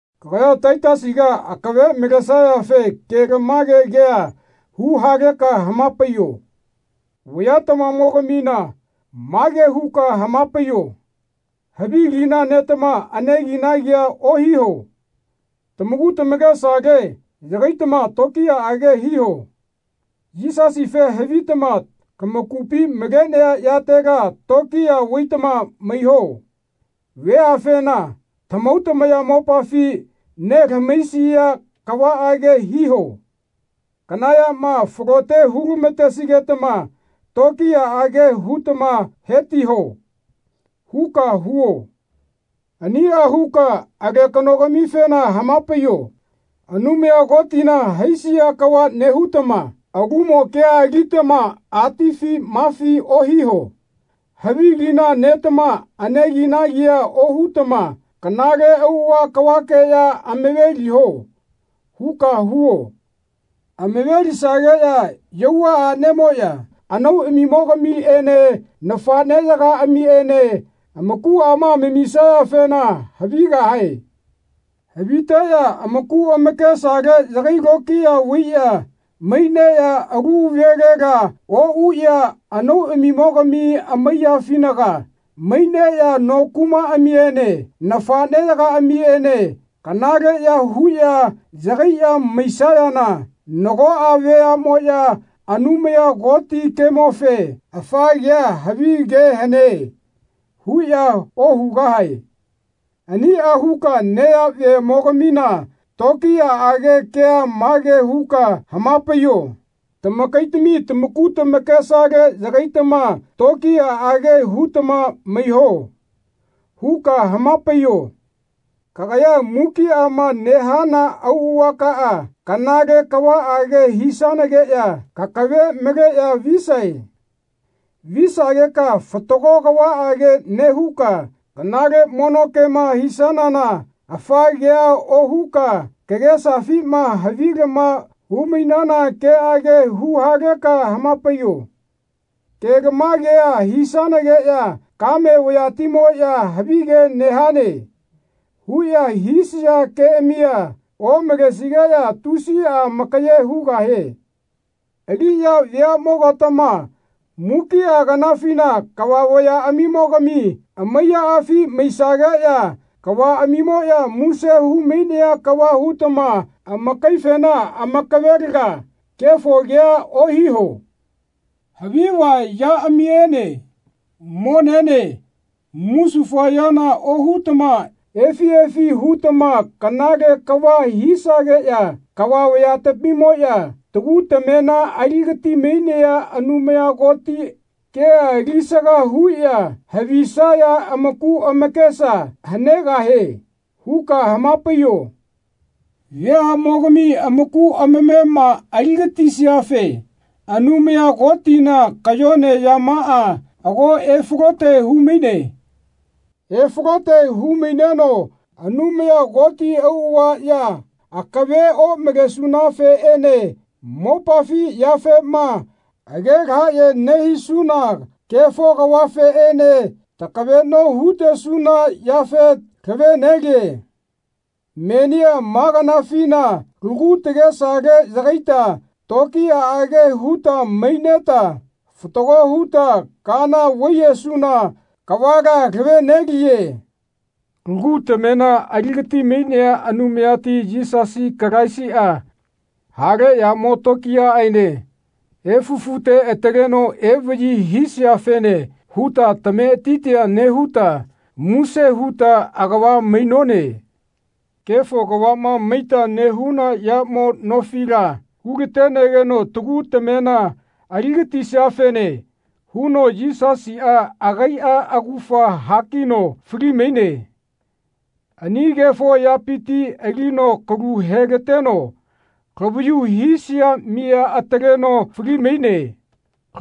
Kagaya Taitasiga akave malesayafe kelamage kea huhaleka hamapaiyo. Vayatamamo-gamina mage huka hamapaiyo Havi lina netama aneginagia ohiho. Tamaku tamakesale yagaitama tokiyaage hiho. Yisasife havitama lamakupi malenaya yatela tokiya vaitama maiho. Veafena tamahau tamayamopafi nelamahaisia kavaage hiho. Kana yama falote hulamatesigetama tokiyaage hutama hetiho. huka huo. Ania huka alekano-gamifena hamapaiyo Anumaya Kotina haisia kava nehutama alumo kea alitama atifi mafi ohiho. Havilina netama aneginagia ohutama kanale auava kavakeya amaveliho. huka huo. Amave-lisageya yauva anemoya anauamimo-gamiene nafaneyagaa-miene amakuama amamisayafena havigahae. Haviteya amaku amakesale yagai lokiya vaiya maineya alu velela ouya anauamimo-gami amaiyafinaga maineya no kumaamiene nafaneyagaamiene kanaleya huya yagaiya maisayana nagoa veamoya Anumaya Koti kemofe Afa kea havi ke hane. huya ohugahae. Ania huka neyavemo-gamina tokiyaage kea mage huka hamapaiyo Tamakaitami tamaku tamakesale yagaitama tokiyaage hutama maiho. huka hamapaiyo. Kagaya mukiama nehana auavakaa kanale kavaage hisanageya kakave maleya visae. Visageka fatago kavaage nehuka kanale mono kema hisanana afa kea ohuka kagesafima havilama hu-mainana keage huhaleka hamapaiyo. Kelamagea hisanageya kame vayatimoya Havige nehane. huya hisaya keamia omalesigeya tusia amakaye hugahie. Aliya veamo-gatama mukia kanafina kava vayaamimo-gami amaiyaafi maisageya kavaamimoya muse hu-mainaya kava hutama amakaifena amakavelaga kefo kea ohiho. Haviva yaamiene monene musufayana ohutama efi efi hutama kanale kava hisageya kava vayatamimoya tagu tamema aligati-mainea Anumaya Koti kea alisaga huya havisaya amaku amakesa hanegahie. huka hamapaiyo. Veamogami amaku amamema aligatisiafe Anumaya Kotina kayone yamaa ago efalote humaine. Efalote humaineno Anumaya Koti auava ya akave omalesunafeene mopafi yafema age lahaye nehisuna kefo kavafeene takaveno hutesuna yafe lave-neliye. Menia ma kanafina lagu tagesale yagaita tokiyaage huta maineta fatago huta kaana vaiyesuna kavala lave-neliye. Lagu tamema aligati-mainea Anumayati Yisasi Kalaisia hale yamo tokiyaaene efufute ataleno evayi hisiafene huta tametitia nehuta muse huta agava mainone. Kefo kavama maita nehuna yamo nofila hulatenegeno tagu tamema aligatisiafene huno Yisasia agaia augafa hakino fali-maine. Ani kefo yapiti alino kalu helateno lavayu hisia miya ataleno fali-maine.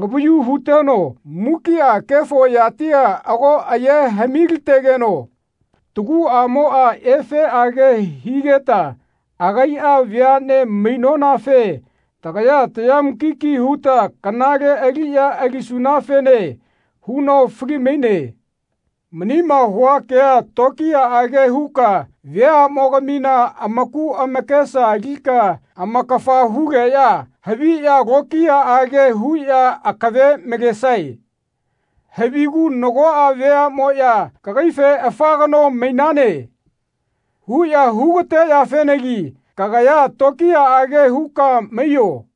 Lavayu huteno mukia kefo yatia ago aye hami-lategeno taguamoa efeage higeta agaia veane mainonafe tagaya taya mukiki huta kanale aliya alisunafene huno fali-maine. Manima hua kea tokiyaage huka veamogamina amaku amakesa alika amakafa hugeya haviya lokiyaage huya akave malesae. Havigu nagoa veamoya kagaife Afa kano mainane. huya hugateyafenagi kagaya tokiyaage huka maiyo.